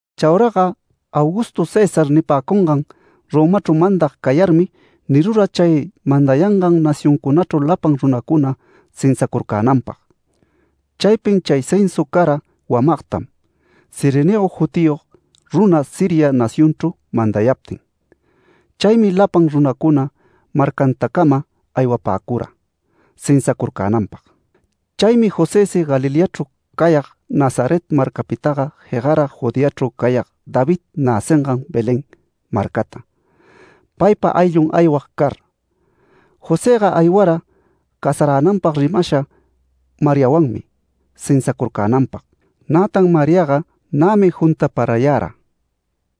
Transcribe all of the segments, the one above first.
Chauraga Augusto César nipäcungan, Romachru mandag cayarmi nirura chay mandayangan nacioncunachru lapan runacuna censacurcänanpag. Chaypin chay censa cara wamagtam, Cirenio jutiyog runa Siria nacionchru mandayaptin. Chaymi lapan runacuna marcantacama aywapäcura censacurcänanpag. Chaymi Josësi Galileachru cayag Nazaret marcapitaga jegara Judeachru cayag David näcingan Belén marcata, paypa ayllun aywag car. Josëga aywara casaränanpag rimashan Mariawanmi censacurcänanpag, nätan Mariaga nämi juntaparayara.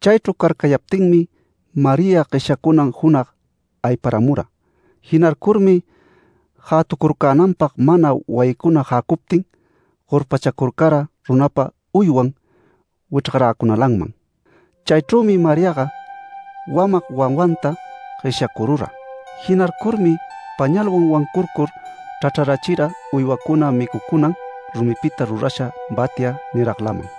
Chaychru carcayaptinmi María gueshyacunan junag ayparamura. Jinarcurmi jätucurcänanpag mana wayicuna jäcuptin, gorpachacurcara runapa uywan wichrgaräcunalanman. Chaychrümi Mariaga wamag wawanta gueshyacurura. Jinarcurmi pañalwan wancurcur chrachrarachira uywacuna micucunan rumipita rurasha batya niraglaman.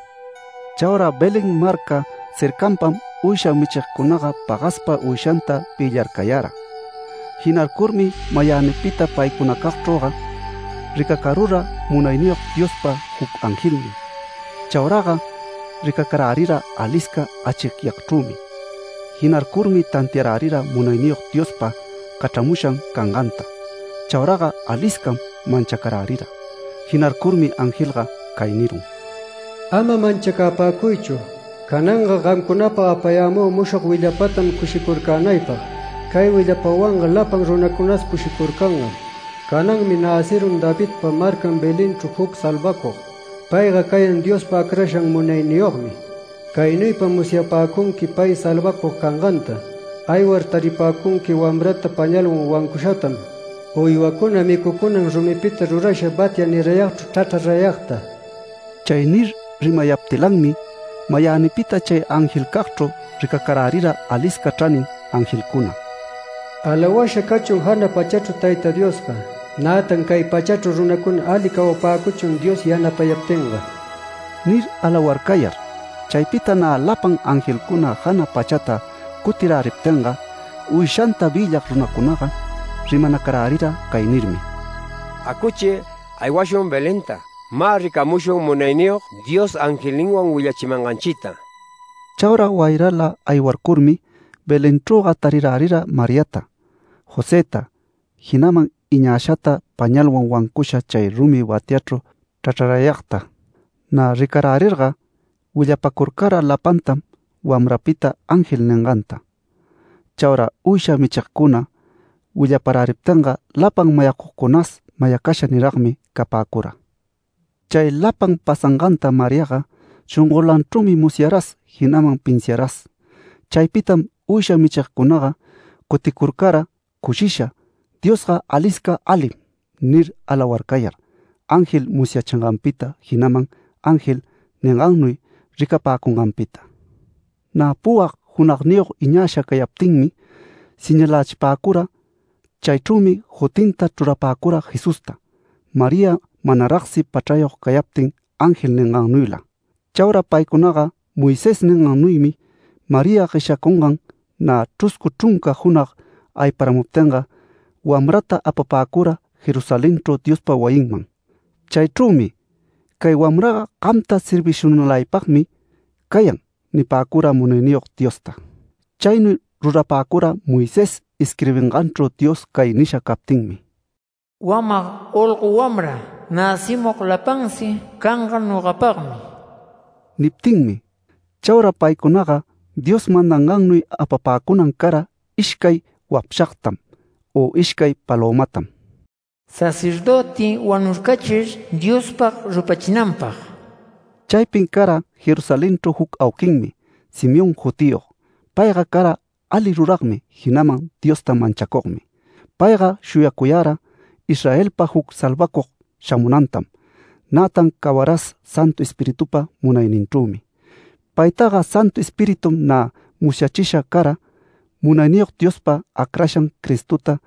Chaura Belén marca cercanpam uysha michigcunaga pagaspa uyshanta vïllarcayara. Jinarcurmi mayänipita paycunacagchrüga ricacarura munayniyog Diospa juc angelnin. Chauraga ricacarärira alisca achicyagchrümi. Jinarcurmi tantiarärira Munayniyog Diospa cachramushan canganta. Chauraga aliscam manchacarärira. Jinarcurmi angelga cay nirun: “Ama manchacapäcuychu. Cananga gamcunapag apayämü mushog willapatam cushicurcänaypag. Cay willapawanga lapan runacunas cushicurcangam. Cananmi näcirun Davidpa marcan Belenchru juc salvacug. Payga cayan Diospa acrashan munayniyogmi. Caynuypam musyapäcunqui pay salvacug canganta: Aywar, taripäcunqui wamrata pañalwan wancushatam, uywacuna micucunan rumipita rurasha batya nirayagchru chrachrarayagta”. Chay nir rimapayaptilanmi, mayänipita chay angelcagchru ricacarärira alisca chranin angelcuna “Alawasha cachun jana pachachru Tayta Diosga, nätan cay pachachru runacuna ali cawapäcuchun Dios yanapayaptinga” nir alawarcayar. Chaypita nä lapan angelcuna jana pachata cutiräriptinga, uyshanta vïllag runacunaga rimanacarärira cay nirmi: “Acuchi. Aywashun Belenta. Mä ricamushun Munayniyog Dios angelninwan willachimanganchita”. Chaura wayrala aywarcurmi Belenchrüga tarirärira Mariata, Josëta, jinaman iñashata, pañalwan wancusha chay rumi batyachru chrachrarayagta. Nä ricarärirga willapacurcara lapantam wamrapita ángel ninganta. Chaura uysha michigcuna willaparäriptinga lapan mayacugcunas mayacasha niragmi capäcura. Chay lapan pasanganta Mariaga shongolanchrümi musyaras, jinaman pinsiaras. Chaypitam uysha michigcunaga cuticurcara cushisha “Diosga alisca alim” nir alawarcayar, ángel musyachinganpita, jinaman ángel ningannuy ricapäcunganpita. Nä puwag junagniyog iñasha cayaptinmi señalächipäcura. Chaychrümi jutinta chrurapäcura Jesusta, María manaragsi pachrayog cayaptin ángel ningannuyla. Chaura paycunaga Moisés ningannuymi María gueshyacungan nä chruscu chrunca junag ayparuptinga, wamrata apapäcura Jerusalenchru Diospa wayinman. Chaychrümi “Cay wamraga gamta servishunalaypagmi cayan” nipäcura Munayniyog Diosta. Chaynuy rurapäcura Moisés isquirbinganchru Dios cay nisha captinmi: “Wamag olgo wamra näcimug lapansi canga nogapagmi” niptinmi. Chaura paycunaga Dios mandangannuy apapäcunan cara ishcay wapshagtam u ishcay palömatam, sacerdöti wanurcachir Diospag rupachinanpag. Chaypin cara Jerusalenchru juc auquinmi Simeón jutiyog. Payga cara ali ruragmi, jinaman Diosta manchacugmi. Payga shuyacuyara Israelpag juc salvacug shamunantam, nätan cawaras Santu Espiritupa munayninchrümi. Paytaga Santu Espiritum nä musyachisha cara, Munayniyog Diospa acrashan Cristota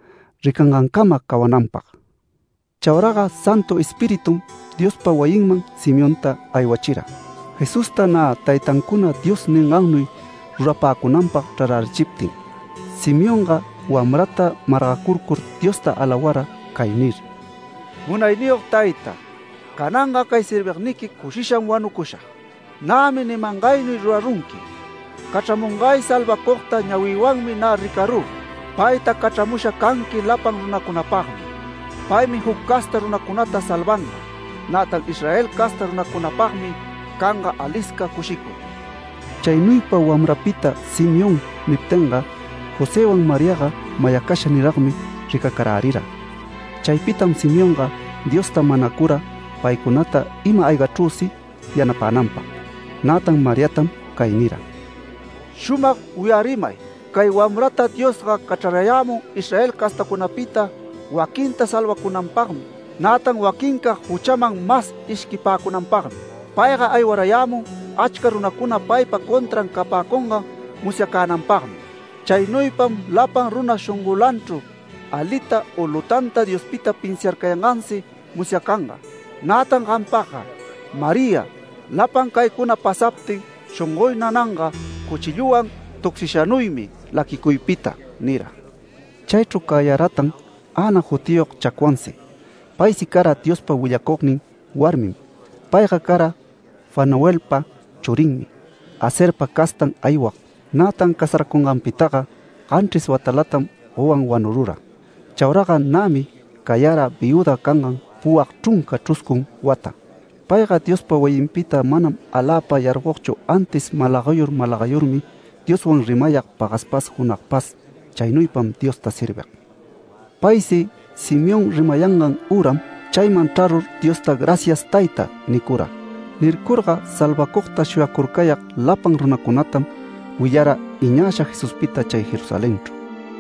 ricangancama cawananpag. Chauraga Santu Espiritum Diospa wayinman Simeonta aywachira. Jesusta nä taytancuna Dios ningannuy rurapäcunanpag chrarärichiptin, Simeonga wamrata margacurcur, Diosta alawara cay nir: “Munayniyog Tayta, cananga cay servigniqui cushisham wanucushag. Nämi nimangaynuy rurarunqui, Cachramungay salvacugta ñawïwanmi nä ricarü. Payta cachramusha canqui lapan runacunapagmi. Paymi juc casta runacunata salvanga, nätan Israel casta runancunapagmi canga alisca cushicuy”. Chaynuypa wamrapita Simeón niptinga, Josëwan Mariaga mayacasha niragmi ricacarärira. Chaypitam Simeonga Diosta manacura paycunata ima-aygachrüsi yanapänagpag. Nätan Mariatam cay nira: “Shumag wiyarimay. Cay wamrata Diosga cachrarayämun Israel castacunapita, waquinta salvacunanpagmi, nätan waquincag juchaman mas ishquicapäcunanpagmi. Payga aywarayämun achca runacuna paypa contran capäcungan musyacänanpagmi. Chaynuypam lapan runa shongolanchru alita u lutanta Diospita pinsiarcayangansi musyacanga. Nätan gampagga María, lapan caycuna pasaptin shongoy nananga cuchilluwan tucsishanuymi laquicuypita” nira. Chaychru cayaratan Ana jutiyog chacwansi. Paysi cara Diospa willacugnin warmim. Payga cara Fanuelpa churinmi, Aserpa castan aywag. Nätan casaräcunganpitaga ganchris watalatam gowan wanurura. Chauraga nämi cayara viüda cangan puwag chrunca chruscun wata. Payga Diospa wayinpita manam aläpa yargogchu, antis malagayur, malagayurmi, Dioswan rimayag pagaspas, junagpas, chaynuypam Diosta servig. Paysi Simeón rimayangan üram, chayman chrarur Diosta “Gracias Tayta” nicura. Nircurga salvacugta shuyacurcayag lapan runacunatam willara iñasha Jesuspita chay Jerusalenchru.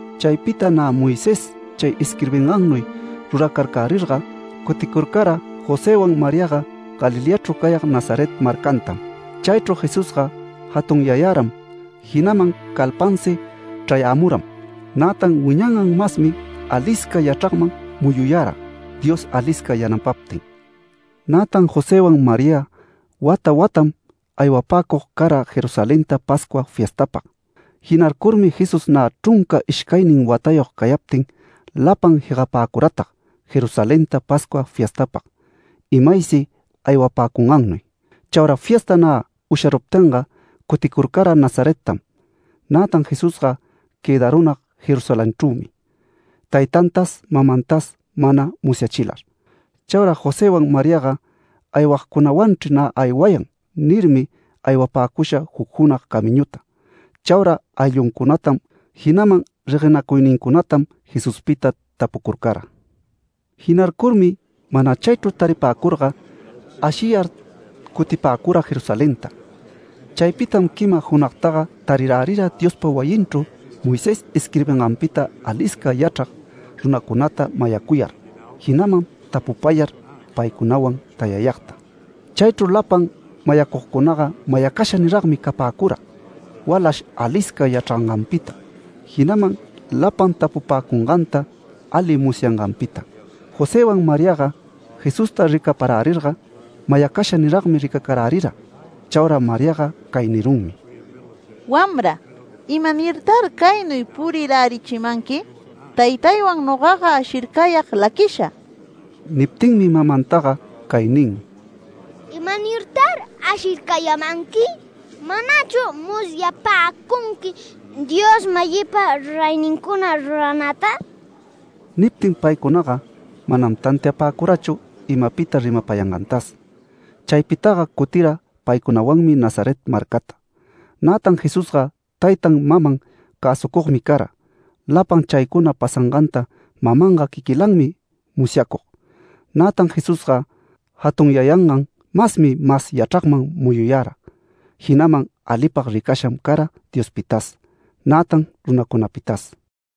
Chaypita nä Moisés chay isquirbingannuy ruracarcärirga, cuticurcara Josëwan Mariaga Galileachru cayag Nazaret marcantam. Chaychru Jesusga jatunyayaram, jinaman calpansi chrayämuram. Nätan wiñangan masmi alisca yachragman muyuyara Dios alisca yanapaptin. Nätan Josëwan María wata watam aywapäcug cara Jerusalenta Pascua fiestapag. Jinarcurmi Jesús nä chrunca ishcaynin watayog cayaptin, lapan jegapäcuratag Jerusalenta Pascua fiestapag, imaysi aywapäcungannuy. Chaura fiesta nä usharuptinga, cuticurcara Nazarettam. Nätan Jesusga quëdarunag Jerusalenchrümi taytantas, mamantas mana musyachilar. Chaura Josëwan Mariaga “Aywagcunawanchri nä aywayan” nirmi, aywapäcusha juc junag camiñuta. Chaura aylluncunatam, jinaman reguenacuynincunatam Jesuspita tapucurcara. Jinarcurmi mana chaychru taripäcurga, ashiyar cutipäcura Jerusalenta. Chaypitam quima junagtaga tarirärira Diospa wayinchru Moisés isquirbinganpita alisca yachrag runacunata mayacuyar, jinaman tapupayar paycunawan tayayagta. Chaychru lapan mayacugcunaga mayacasha niragmi capäcura walash alisca yachranganpita, jinaman lapan tapupäcunganta ali musyanganpita. Josëwan Mariaga Jesusta ricaparärirga mayacasha niragmi ricacarärira. Chaura Mariaga cay nirunmi: “Wamra, ¿imanirtar caynuy purirärichimanqui? Taytaywan nogaga ashircayag laquisha”. Niptinmi mamantaga cay nin: “¿Imanirtar ashircayämanqui? ¿Manachu musyapäcunqui Dios-mayïpa ruraynincuna ruranäta?” Niptin paycunaga manam tantiapäcurachu imapita rimapayangantas. Chaypitaga cutira paycunawanmi Nazaret marcata. Nätan Jesusga taytan maman cäsucugmi cara. Lapan chaycuna pasanganta mamanga quiquilanmi musyacug. Nätan Jesusga jatunyayangan masmi mas yachragman muyuyara, jinaman alipag ricasham cara Diospitas, nätan runacunapitas.